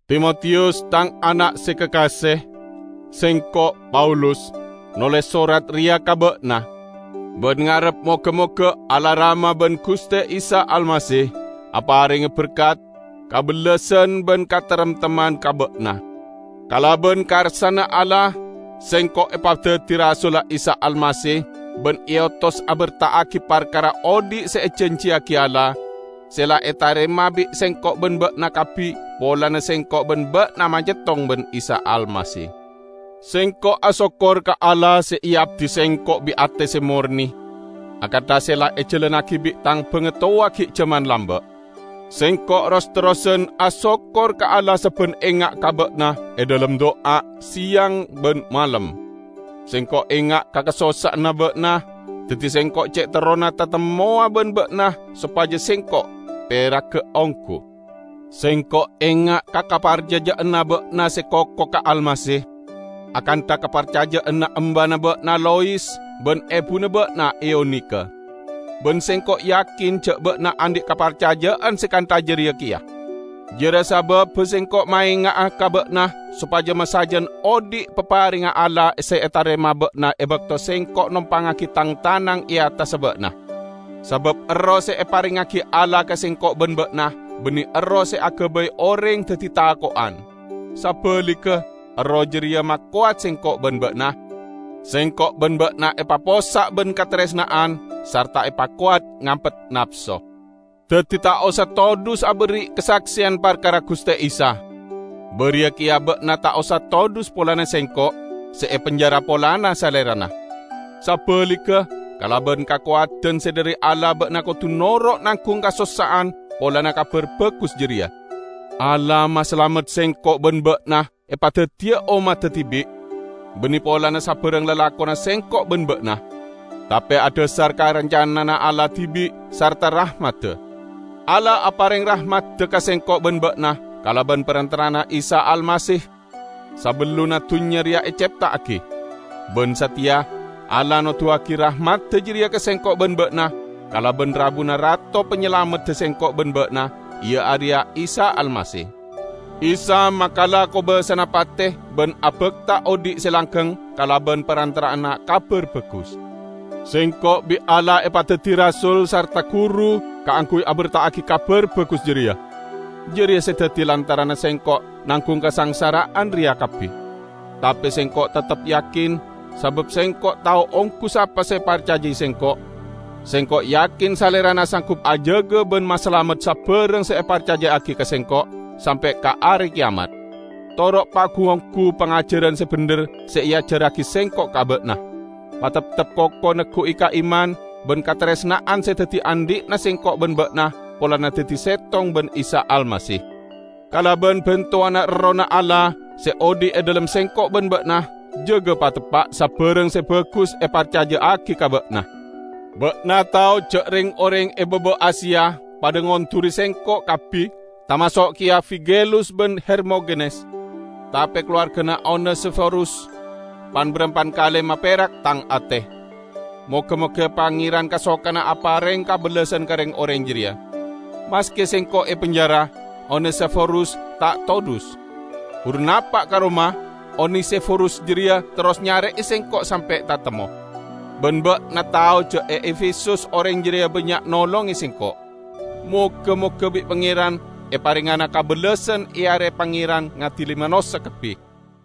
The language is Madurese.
Timotiyus, tang ana' se kakase! Sengko', Paulus, noles sorat reya ka ba'na, ban ngarep moga-moga Allah Rama ban Guste Isa Almasih aparenga berkat, kabellasan ban kataremtemman ka ba'na. Kalaban karsana Allah, sengko' epadaddi rasulla Isa Almasih ban eotos aberta'agi parkara odhi' se ejanjiyagi Allah, se la etarema bi' sengko' ban ba'na kabbi polana sengko' ban ba'na manyettong ban Isa Almasih. Sengko' asokkor ka Allah se eabdi sengko' bi' ate se morne akantha se la ejalannagi bi' tang bangatowa gi' jaman lamba'. Sengko' ros-terrosan asokkor ka Allah sabban enga' ka ba'na e dhalem du'a, seyang ban malem. Sengko' enga' ka kasossa'anna ba'na, daddi sengko' ce' terrona tatemmowa ban ba'na sopaja sengko' peraga onggu. Sengko' enga' ka kaparcaja'anna ba'na se koko ka Almasih, akantha kaparcaja'anna embana ba'na Lois ban ebuna ba'na Eunike. Ban sengko' yakin ja' ba'na andhi' kaparcaja'an se kantha jareya keya. Jareya sababba sengko' maenga'a ka ba'na sopaja masajan odhi' paparengnga Allah se etarema ba'na e bakto sengko' nompangngagi tang tanang e attassa ba'na. Sabab Erroh se eparengngagi Allah ka sengko' ban ba'na banne Erroh se agabay oreng daddi tako'an. Sabaligga Erroh jareya makowat sengko' ban ba'na, sengko' ban ba'na epapossa' ban kataresna'an sarta epakowat ngampet napso. Daddi ta' osa todhus aberri' kasakseyan parkara Guste Isa. Bariya keya ba'na ta' osa todhus polana sengko', se e penjara polana Salerana. Sabaligga, kalaban kakowadan se dhari Allah ba'na kodu noro' nanggung kasossa'an polana Kabar Bagus jareya. Allah masalamet sengko' ban ba'na epadaddiya ommadda dibi'. Banne polana sabarang lalakonna sengko' ban ba'na, tape adhasar ka rancanana Allah dibi' sarta rahmadda. Allah apareng rahmadda ka sengko' ban ba'na kalaban parantara'anna Isa Almasih sabellunna dunnya reya ecepta'agi. Ban sateya, Allah noduwagi rahmadda jareya ka sengko' ban ba'na kalaban rabuna Rato Panyalamedda sengko' ban ba'na, iya areya Isa Almasih. Isa makala kobasana pate ban abakta odhi' se langgeng kalaban parantara'anna Kabar Bagus. Sengko' bi' Allah epadaddi rasul sarta guru kaangguy aberta'agi Kabar Bagus jareya. Jareya se daddi lantaranna sengko' nanggung kasangsara'an reya kabbi. Tape sengko' teptep yakin, sabab sengko' tao onggu sapa se eparcajai sengko'. Sengko' yakin Salerana sanggup ajaga ban masalamet sabarang se eparcaja'agi ka sengko', sampe' ka Are Keyamat. Toro' pagu-onggu pangajaran se bendher se eajarragi sengko' ka ba'na. Pateptep koko neggu'i ka iman ban kataresna'an se daddi andhi'na sengko' ban ba'na polana daddi settong ban Isa Almasih. Kalaban bantowanna Errohna Allah se odhi' e dhalem sengko' ban ba'na, jaga pateppa' sabarang se bagus se eparcaja'agi ka ba'na. Ba'na tao ja' reng-oreng e baba Asia padha ngonduri sengko' kabbi, tamaso' keya Figelus ban Hermogenes. Tape kalowargana Onesiforus pan-barampan kale maperak tang ate; moga-moga Pangeran kasokana apareng kabellasan ka reng-oreng jareya. Maske sengko' e penjara, Onesiforus ta' todhus. Buru napa' ka Roma Onesiforus jareya terros nyare'e sengko' sampe' tatemmo. Ban ba'na tao ja' e Efesus oreng jareya bannya' nolonge sengko'. Moga-moga bi' Pangeran eparengngana kabellasan e are Pangeran ngadili manossa kabbi.